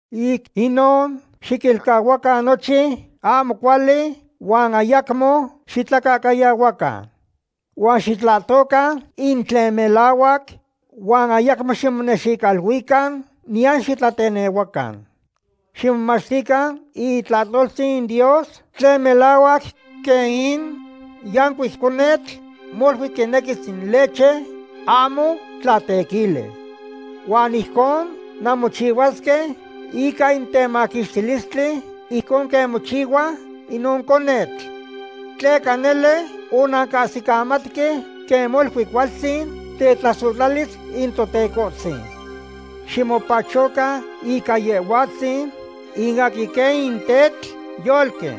Ic inon, xiquilcahuacan nochin ahmo cuali, huan ayacmo xitlacahcayahuacan. Huan xitlahtocan in tlen melahuac, huan ayacmo ximonexicoluican, niyan xitlatenehuacan. Ximomachtican in itlahtoltzin Dios tlen melahuac quen in yancuic conetl molui quinequis in leche ahmo tlatequili. Huan ijcon nanmochicahuisque ica in temaquixtilistli ijcon quen mochicahuas inon conetl. Tleca nele onancahsicamatque quen molui cualtzin tetlasohtlalis in Totecohtzin. Ximopachocan ica Yehhuatzin, in aquin quen in tetl yolqui.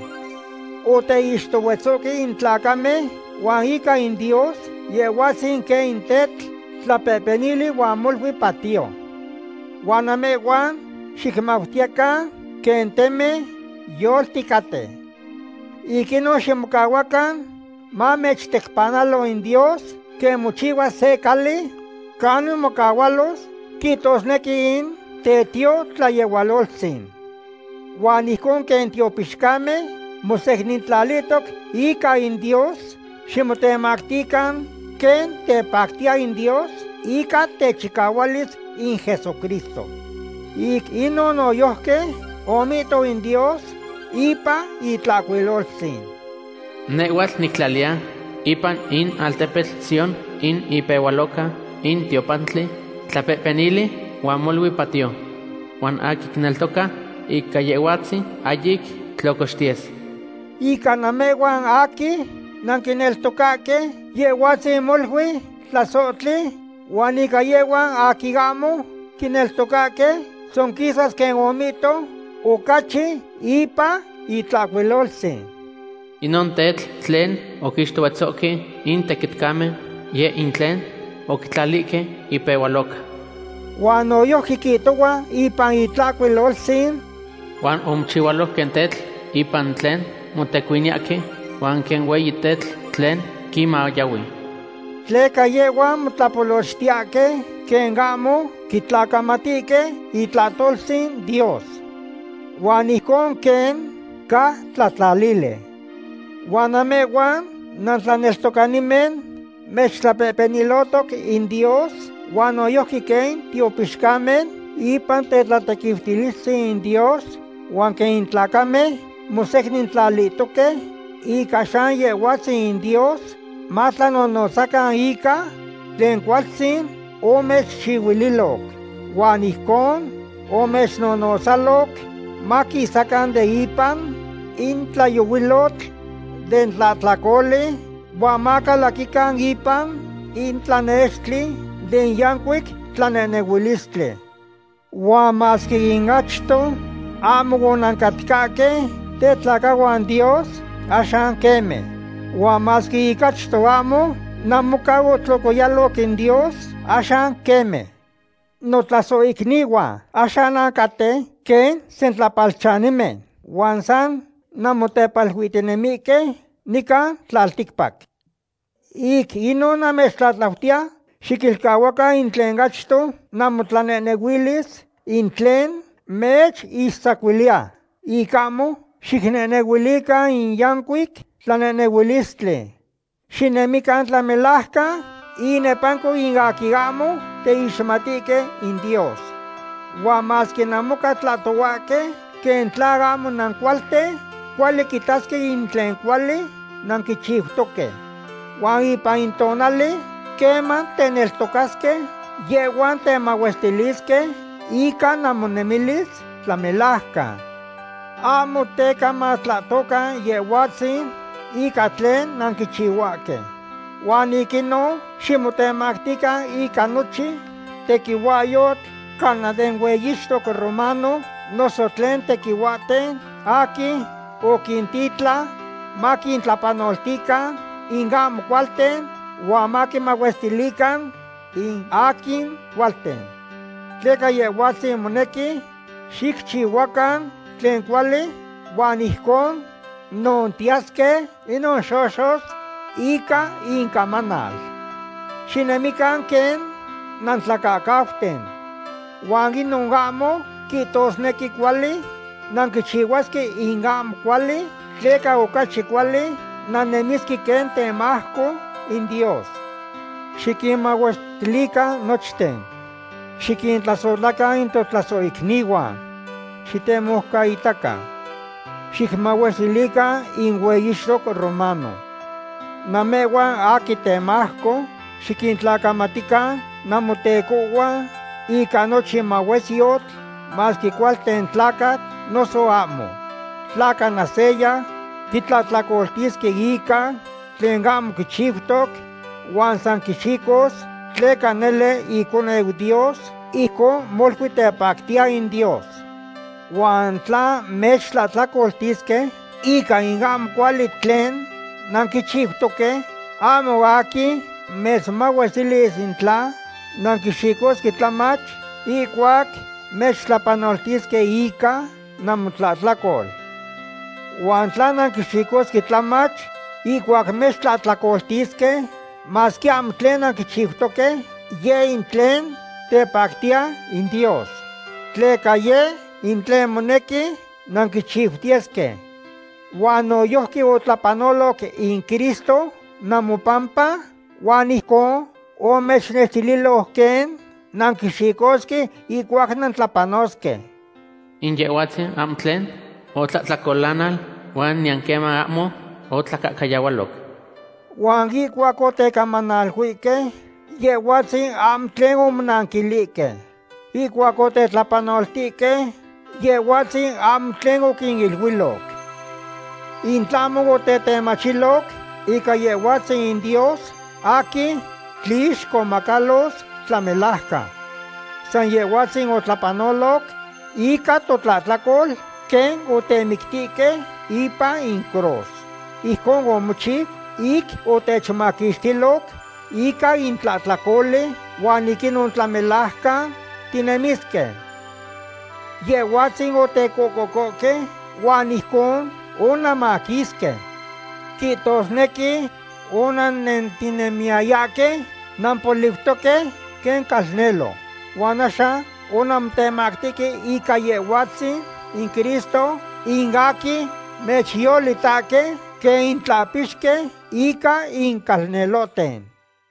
Oteixtohuetzohque in tlacamen, huan ica in Dios, Yehhuatzin quen in tetl tlapehpenili huan molui patiyo. Huan namehhuan xicmautiyecan quen temen yolticaten. Ic inon ximocahuacan mamechtecpanalo in Dios quen mochihchihua se cali canin mocahualos, quihtosnequi in tetiotlayehualoltzin. Huan ijcon quen tiopixcamen mosecnintlalihtoc ica in Dios, ximotemactican quen tepactiya in Dios ica techicahualis in Jesucristo. Ic inon noyojqui omihto in Dios ipan Itlahcuiloltzin: Nehhuatl nictlaliya ipan in altepetl Sión in ipehualoca in tiopantli, tlapehpenili huan molui patiyo. Huan in aquin quineltoca ica Yehhuatzin ahyic tlocoxtiyes. Ica namehhuan aquin nanquineltocahque, Yehhuatzin molui tlasohtli, huan ica yehhuan aquin ahmo quineltocahque, tzonquisas quen omihto ocachi ipan Itlahcuiloltzin: Inon tetl tlen oquixtohuetzohque in tequitcamen, yeh in tlen oquitlalihque ipehualoca. Huan noyojqui quihtohua ipan Itlahcuiloltzin: Huan omochihualo quen tetl ipan tlen motecuiniyahque, huan quen hueyi tetl tlen quinmayahui. Tleca yehhuan motlapolochtiyahque quen ahmo quitlacamatihque itlahtoltzin Dios. Huan ijcon quen ca tlatlalili. Huan namehhuan nantlaneltocanimen mechtlapehpenilohtoc in Dios, huan noyojqui quen tiopixcamen ipan tetlatequiutilistzin in Dios, huan quen tlacamen mosecnintlalihtoque ica san Yehhuatzin in Dios, matlanonotzacan ica tlen cualtzin omechchihchihuililoc. Huan ijcon omechnonotzaloc maquisacan de ipan in tlayohuilotl den tlahtlacoli huan macalaquican ipan in tlanextli den yancuic tlanehnehuilistli. Huan masque ic achto ahmo onancatcahque tetlacahuan Dios, axan queme. Huan masque ic achto ahmo namoca otlocoyaloc in Dios, axan queme. Notlasohicnihuan, axan nancaten quen sentlapalchanimen huan san nanmotepaluihtinemihque nican tlalticpac. Ic inon namechtlatlautiya xiquilcahuacan in tlen achto namotlanehnehuilis, in tlen mechixtzacuiliya ic ahmo xicnehnehuilican in yancuic tlanehnehuilistli. Xinemican tlamelajcan inepanco in aquin ahmo teixmatihque in Dios. Huan masque namoca tlahtohuahque quen tla ahmo nancualten, cuali quitasque in tlen cuali nanquichiutoque. Huan ipan in tonali queman teneltocasque, yehhuan temahuestilisque ica namonemilis tlamelajcan. Ahmo teca matlahtocan Yehhuatzin ica tlen nanquichihuahque. Huan ic inon ximotemactican ica nochin tequihuahyotl, cana den hueyixtoc romano, noso tlen tequihuahten aquin oquintitlan maquintlapanoltican in ahmo cualten huan maquinmahuestilican in aquin cualten. Tleca Yehhuatzin monequi xicchihuacan tlen cuali huan ijcon nontiyasque inon xoxos ica incamanal. Xinemican quen nantlacahcauten. Huan inon ahmo quihtosnequi cuali nanquichihuasque in ahmo cuali, tleca ocachi cuali nannemisque quen temajco in Dios. Xiquinmahuestilican nochten. Xiquintlasohtlacan in totlasohicnihuan. Xitemoucaitacan. Xicmahuestilican in hueyixtoc romano. Namehhuan aquin temajco, xiquintlacamatican namotecohhuan ica nochin mahuesyotl, masque cualten tlacatl noso ahmo. Tla cana seya quitlahtlacoltisque ica tlen ahmo quichiutoc, huan san quixicos tleca nele iconeu Dios, ijcon molui tepactiya in Dios. Huan tla mechtlahtlacoltisque ica in ahmo cuali tlen nanquichiutoque, ahmo aquin mechmahuestilis in tla nanquixicosque tlamach ihcuac mechtlapanoltisque ica namotlahtlacol. Huan tla nanquixicosque tlamach ihcuac mechtlahtlacoltisque, masque ahmo tlen nanquichiutoque, yeh in tlen tepactiya in Dios. Tleca yeh in tlen monequi nanquichiutiyesque. Huan noyojqui otlapanoloc in Cristo namopampa, huan ijcon omechnextililoc quen nanquixicosque ihcuac nantlapanosque. In Yehhuatzin ahmo tlen otlahtlacolanal huan niyan queman ahmo otlacahcayahualo. Huan ihcuac otecamanaluihque, Yehhuatzin ahmo tlen omonanquilihque. Ihcuac otetlapanoltihque, Yehhuatzin ahmo tlen oquiniluiloc. In tlahmo otetemachiloc ica Yehhuatzin Dios aquin tlixcomacalos tlamelajcan. San Yehhuatzin otlapanoloc ica totlahtlacol quen otemictihque ipan in cruz. Ijcon omochiu ic otechmaquixtiloc ica in tlahtlacoli, huan ic inon tlamelajcan tinemisque. Yehhuatzin otecocohque huan ijcon onanmaquisque. Quihtosnequi onannentinemiyayahque nampoliutoque quen calnelo. Huan axan onanmotemactihque ica Yehhuatzin in Cristo, in aquin mechyolitahque quen in tlahpixqui ica in calnelohten.